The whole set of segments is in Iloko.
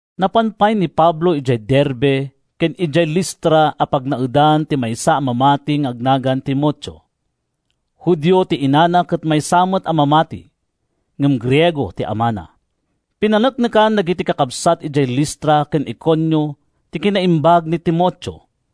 Napan pay ni Pablo idiay Derbe ken idiay Listra a pagnaedan ti maysa a mamati nga agnagan Timoteo. Judio ti inana ket maysa met a mamati, ngem Griego ti amana. Pinaneknekan dagiti kakabsat idiay Listra ken Iconio ti kinaimbag ni Timoteo.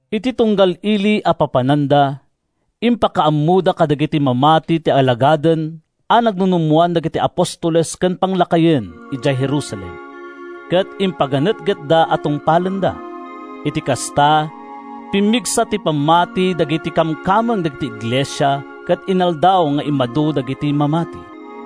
Iti tunggal ili a papananda, impakaammoda kadagiti mamati ti alagaden a nagnunummoan dagiti apostoles ken panglakayen idiay Jerusalem, ket impaganetgetda a tungpalenda. Iti kasta, pimmigsa ti pammati dagiti kamkameng dagiti iglesia ket inaldaw nga immadu dagiti mamati.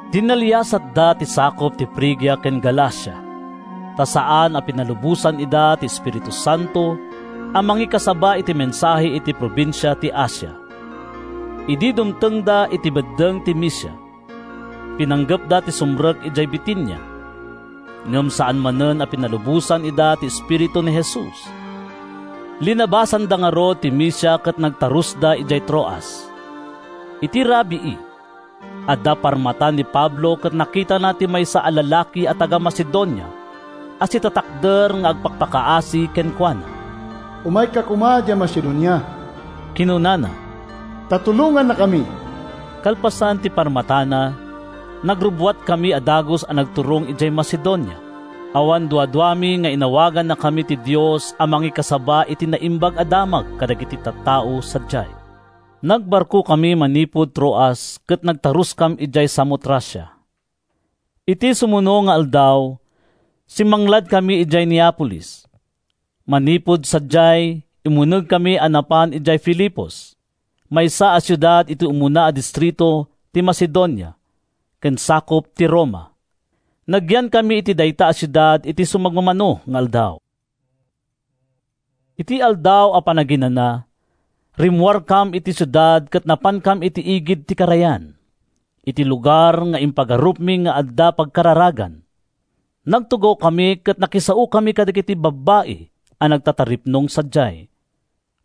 Dinalliasatda ti sakup ti Frigia ken Galacia, ta saan a pinalubosan ida ti Espiritu Santo a mangikasaba iti mensahe iti probinsia ti Asia. Idi dumtengda iti beddeng ti Misia, pinanggepda ti sumrek idiay Bitinia, ngem saan manen a pinalubosan ida ti Espiritu ni Jesus. Linabasanda ngarud ti Misia ket nagtarusda idiay Troas. Iti rabii, adda parmata ni Pablo ket nakitana ti maysa a lalaki a taga-Macedonia a sitatakder nga agpakpakaasi kenkuana. “Umayka koma idiay Macedonia,” kinunana, “ta tulongannakami!” Kalpasan ti parmatana, nagrubbuatkami a dagus a nagturong idiay Macedonia. Awan duaduami nga inawagannakami ti Dios a mangikasaba iti Naimbag a Damag kadagiti tattao sadiay. Nagbarkokami manipud Troas ket nagtaruskam idiay Samotracia. Iti sumuno nga aldaw, simmangladkami idiay Neapolis. Manipud sadiay, immunegkami a napan idiay Filipos, maysa a siudad iti umuna a distrito ti Macedonia, ken sakup ti Roma. Nagyankami iti dayta a siudad iti sumagmamano nga aldaw. Iti Aldaw a Panaginana, rimmuarkam iti siudad ket napankam iti igid ti karayan, iti lugar nga impagarupmi nga adda pagkararagan. Nagtugawkami ket nakisaokami kadagiti babbai a nagtataripnong sadiay.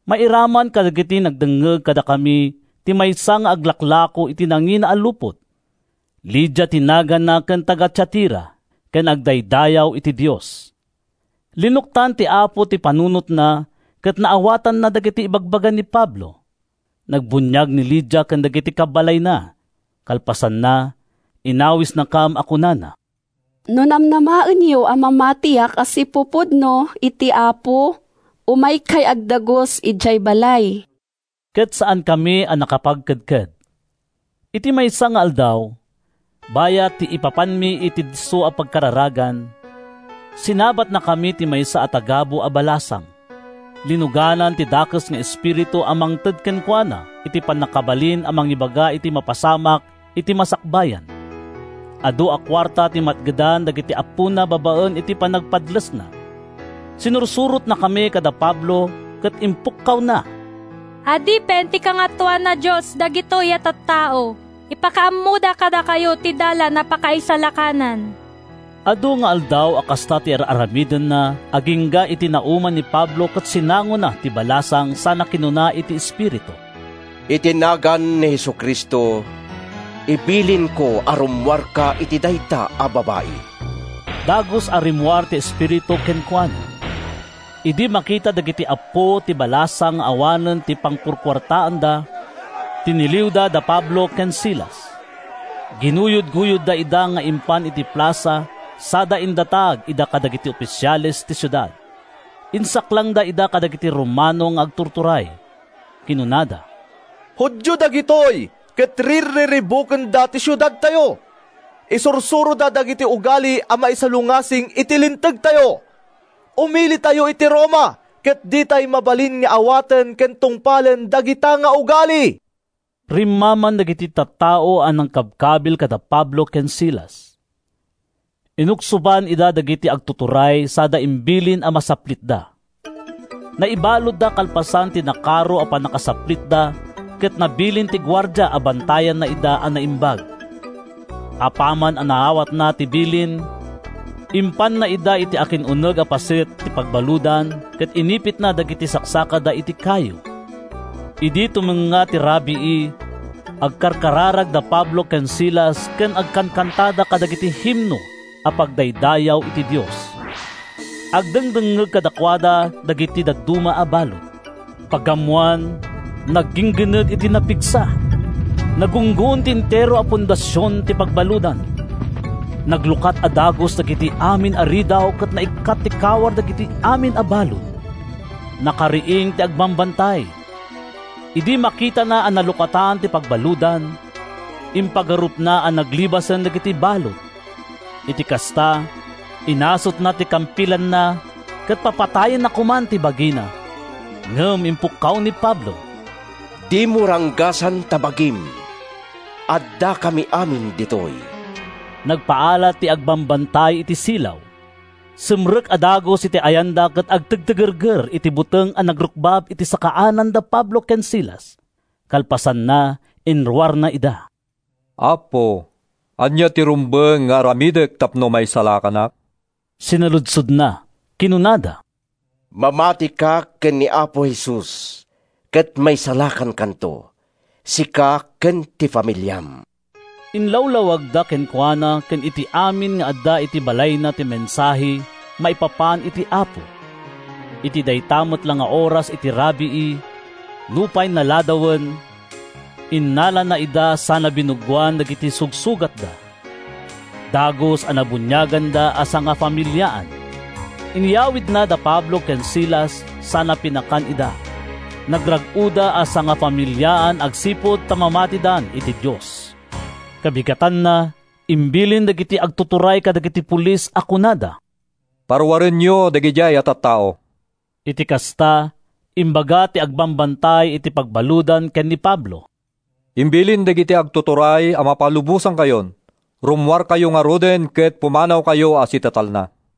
Mairaman kadagiti nagdengngeg kadakami ti maysa nga aglaklako iti nangingina a lupot. Lydia ti naganna ken taga-Tiatira ken agdaydayaw iti Dios; linuktan ti Apo ti panunotna ket naawatanna dagiti ibagbaga ni Pablo. Nagbuniag ni Lydia ken dagiti kabbalayna. Kalpasanna, inawisnakam a kunana, “No namnamaenyo a mamatiak a sipupudno iti Apo, umaykay agdagus idiay balay.” Ket saankami a nakapagkedked. Iti maysa nga aldaw, bayat ti ipapanmi iti disso a pagkararagan, sinabatnakami ti maysa a tagabu a balasang. Linuganan ti dakes nga espiritu a mangted kenkuana iti pannakabalin a mangibaga iti mapasamak iti masakbayan. Adu a kuarta ti matgedan dagiti appona babaen iti panagpadlesna. Sinursurotnakami kada Pablo ket ipukpukkawna, “Adipen ti Kangatoan a Dios dagitoy a tattao. Ipakaammoda kadakayo ti dalan a pakaisalakanan!” Adu nga aldaw a kasta ti ar-aramidenna agingga iti nauma ni Pablo ket sinangona ti balasang sana kinuna iti espiritu, “Iti nagan ni Jesu-Cristo, ibilinko a rummuarka iti dayta a babai.” Dagus a rimmuar ti espiritu kenkuana. Idi makita dagiti appo ti balasang nga awanen ti pangkukuartaanda, tiniliwda da Pablo ken Silas. Ginuyodguyodda ida nga impan iti plasa sada indatag ida kadagiti ofisiales ti siudad. Insaklangda ida kadagiti Romano nga agtuturay. Kinunada, “Judio dagitoy ket rirriribukenda ti siudadtayo. Isursuroda dagiti ugali a maisalungasing iti lintegtayo. Umilitayo iti Roma ket ditay mabalin nga awaten ken tungpalen dagita nga ugali!” Rimmaman dagiti tattao a nangkabkabil kada Pablo ken Silas. Inuksoban ida dagiti agtuturay sada imbilin a masaplitda. Naibaludda kalpasan ti nakaro a pannakasaplitda ket nabilin ti guardia a bantayanna ida a naimbag. Apaman a naawatna ti bilin, impanna ida iti akin-uneg a paset ti pagbaludan ket inipitna dagiti saksakada iti kayo. Idi tumengnga ti rabii, agkarkararag da Pablo ken Silas ken agkankantada kadagiti himno a pagdaydayaw iti Dios. Agdengdengngeg kadakuada dagiti dadduma a balud. Pagammoan, nagginggined iti napigsa. Nagunggon ti entero a fondasion ti pagbaludan. Naglukat a dagus dagiti amin a ridaw ket naikkat ti kawar dagiti amin a balud. Nakariing ti agbambantay. Idi makitana a nalukatan ti pagbaludan, impagarupna a naglibasen dagiti balud. Iti kasta, inasutna ti kampilanna ket papatayenna koman ti bagina. Ngem impukkaw ni Pablo, “Dimo ranggasan ta bagim! Addakam amin ditoy!” Nagpaala ti agbambantay iti silaw. Simrek a dagus iti ayanda ket agtigtigerger iti buteng a nagrukbab iti sakaanan da Pablo ken Silas. Kalpasanna, inruarna ida. “Appo, ania ti rumbeng nga aramidek tapno maisalakanak?” sinaludsodna. Kinunada, “Mamatika ken ni Apo Jesus ket maisalakankanto, sika ken ti familiam.” Inlawlawagda kenkuana ken iti amin nga adda iti balayna ti mensahe maipapan iti Apo. Iti dayta met la nga oras iti rabii, nupay naladawen, innalana ida sana binuggoan dagiti sugsugatda. Dagus a nabuniaganda a sangafamiliaan. Inyawidna da Pablo ken Silas sana pinakan ida. Nagrag-oda a sangafamiliaan agsipud ta mamatidan iti Dios. Kabigatanna, imbilin dagiti agtuturay kadagiti polis a kunada, “Paruarenyo dagidiay a tattao.” Iti kasta, imbaga ti agbambantay iti pagbaludan ken ni Pablo, “Imbilin dagiti agtuturay a mapalubosankayon. Rummuarkayo ngaruden ket pumanawkayo a sitatalna.”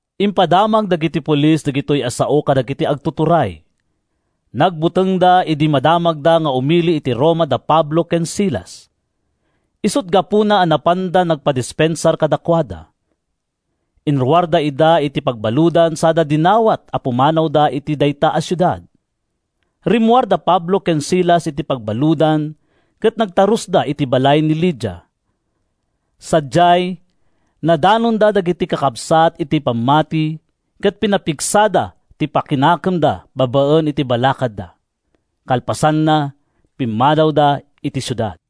Impadamag dagiti polis daytoy a sao kadagiti agtuturay. Nagbutengda idi madamagda nga umili iti Roma da Pablo ken Silas. Isut’ gapuna a napanda nagpadispensar kadakuada. Inruarda ida iti pagbaludan sada dinawat a pumanawda iti dayta a siudad. Rimmuar da Pablo ken Silas iti pagbaludan ket nagtarusda iti balay ni Lydia. Sadiay, nadanonda dagiti kakabsat iti pammati ket pinapigsada ti pakinakemda babaen iti balakadda. Kalpasanna, pimmanawda iti siudad.